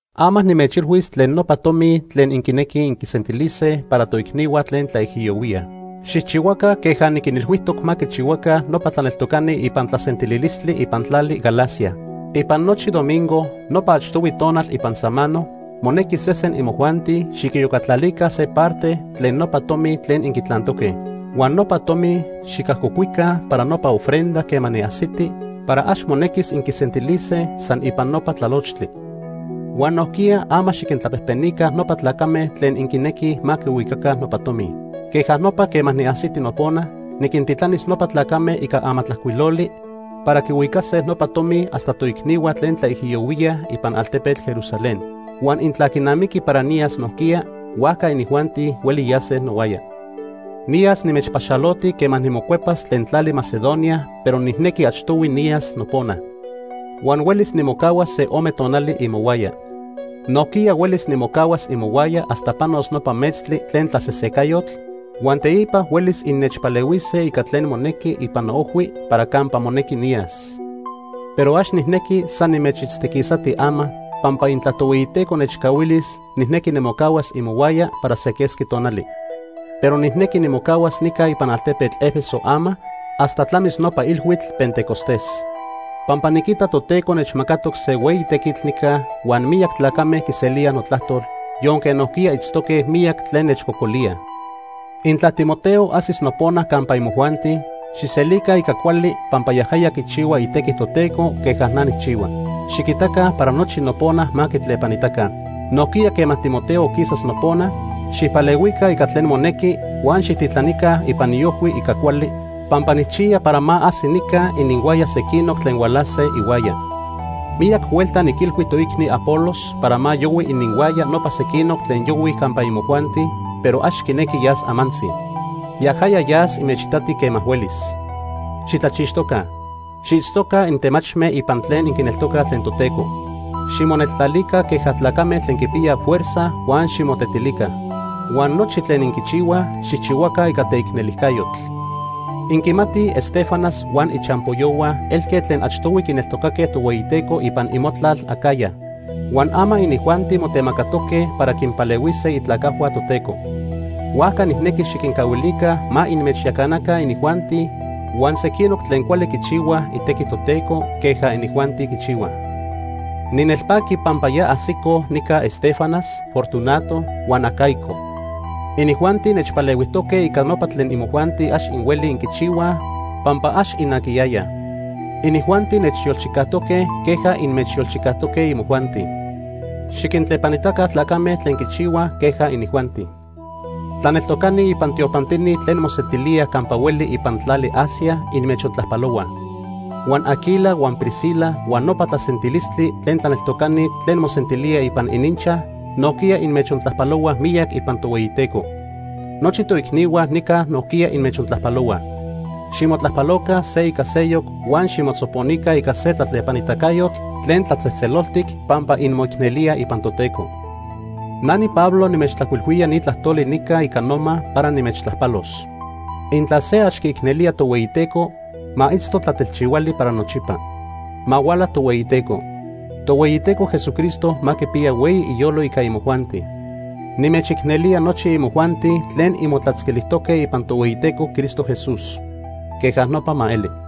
Ama nimechilhuis tlen nopa tomi tlen inquinequij inquisentilise para toicnihua tlen tlaijiyohuíaj. Xijchihuaca queja niquinilhuijtoc ma quichihuaca nopa tlaneltocani ipan tlasentililistli ipan tlali Galacia. Ipan nochi domingo, nopa achtohui tonal ipan samano, monequi sesen imojuanti xiquiyocatlalica se parte tlen nopa tomi tlen inquitlantoque. Huan nopa tomi xicajcocuica para nopa ofrenda quema niajsiti para ax monequis inquisentilise san ipan nopa tlalochtli. Huan nojquiya ama xiquintlapejpenica nopa tlacame tlen inquinequij ma quihuicaca nopa tomi. Queja nopa quema niajsiti nopona, niquintitlanis nopa tlacame ica amatlajcuiloli para quihuicase nopa tomi hasta toicnihua tlen tlaijiyohuíaj ipan altepetl Jerusalén. Huan intla quinamiqui para niyas nojquiya, huajca inijuanti hueli yase nohuaya. Niyas nimechpaxaloti quema nimocuepas tlen tlali Macedonia pero nijnequi achtohui niyas nopona. Huan huelis nimocahuas se ome tonali imohuaya. Nojquiya huelis nimocahuas imohuaya hasta panos nopa metztli tlen tlasesecayotl, huan teipa huelis innechpalehuise ica tlen monequi ipan noojhui para campa monequi niyas. Pero ax nijnequi san nimechitztiquisati ama, pampa intla Tohueyiteco nechcahuilis, nijnequi nimocahuas imohuaya para se quesqui tonali. Pero nijnequi nimocahuas nica ipan altepetl Éfeso ama hasta tlamis nopa Ilhuitl Pentecostés. Pampa niquita Toteco nechmacatoc se hueyi tequitl nica huan miyac tlacame quiselíaj notlajtol, yonque nojquiya itztoque miyac tlen nechcocolíaj. Intla Timoteo ajsis nopona campa imojuanti, xijselica ica cuali pampa yajaya quichihua itequi Toteco queja na nijchihua. Xiquitaca para nochi nopona ma quitlepanitaca. Nojquiya quema Timoteo quisas nopona, xijpalehuica ica tlen monequi huan xijtitlanica ipan iojhui ica cuali, pampa nijchiya para ma ajsi nica ininhuaya sequinoc tlen hualase ihuaya. Miyac huelta niquilhui toicni Apolos para ma yohui ininhuaya nopa sequinoc tlen yohuij campa imojuanti, pero ax quinequi yas amantzi. Yajaya yas inmechitati quema huelis. Xitlachixtoca. Xiitztoca intemachme ipan tlen inquineltocaj tlen Toteco. Ximoneltlalica queja tlacame tlen quipiyaj fuerza huan ximotetilica. Huan nochi tlen inquichihuaj, xijchihuaca ica teicnelijcayotl. Inquimatij Estéfanas huan ichampoyohua elque tlen achtohui quineltocaque Tohueyiteco ipan imotlal Acaya. Huan ama inijuanti motemacatoque para quinpalehuise itlacajhua Toteco. Huajca nijnequi xiquincahuilica ma inmechyacanaca inijuanti huan sequinoc tlen cuali quichihuaj itequi Toteco queja inijuanti quichihuaj. Ninelpaqui pampa ya ajsicoj nica Estéfanas, Fortunato, huan Acaico. Inijuanti nechpalehuijtoque ica nopa tlen imojuanti ax inhuelij inquichihuaj pampa ax inaquiyayaj. Inijuanti nechyolchicajtoque queja inmechyolchicajtoque imojuanti. Xiquintlepanitaca tlacame tlen quichihuaj queja inijuanti. Tlaneltocani ipan tiopantini tlen mosentilíaj campa hueli ipan tlali Asia inmechontlajpalohuaj. Huan Aquila huan Priscila huan nopa tlasentilistli tlen tlaneltocani tlen mosentilíaj ipan ininchaj nojquiya inmechontlajpalohuaj miyac ipan Tohueyiteco. Nochi toicnihua nica nojquiya inmechontlajpalohuaj. Ximotlajpaloca se ica seyoc huan ximotzoponica ica se tlatlepanitacayotl tlen tlatzejtzeloltic pampa inmoicnelíaj ipan Toteco. Na niPablo nimechtlajcuilhuía ni tlajtoli nica ica noma para nimechtlajpalos. Intla se ax quiicnelía Tohueyiteco, ma itzto tlatelchihuali para nochipa. Ma huala Tohueyiteco. Tohueyiteco Jesucristo ma quipiya hueyi iyolo ica imojuanti. Nimechicnelía nochi imojuanti tlen inmotlatzquilijtoque ipan Tohueyiteco Cristo Jesús. Queja nopa ma eli.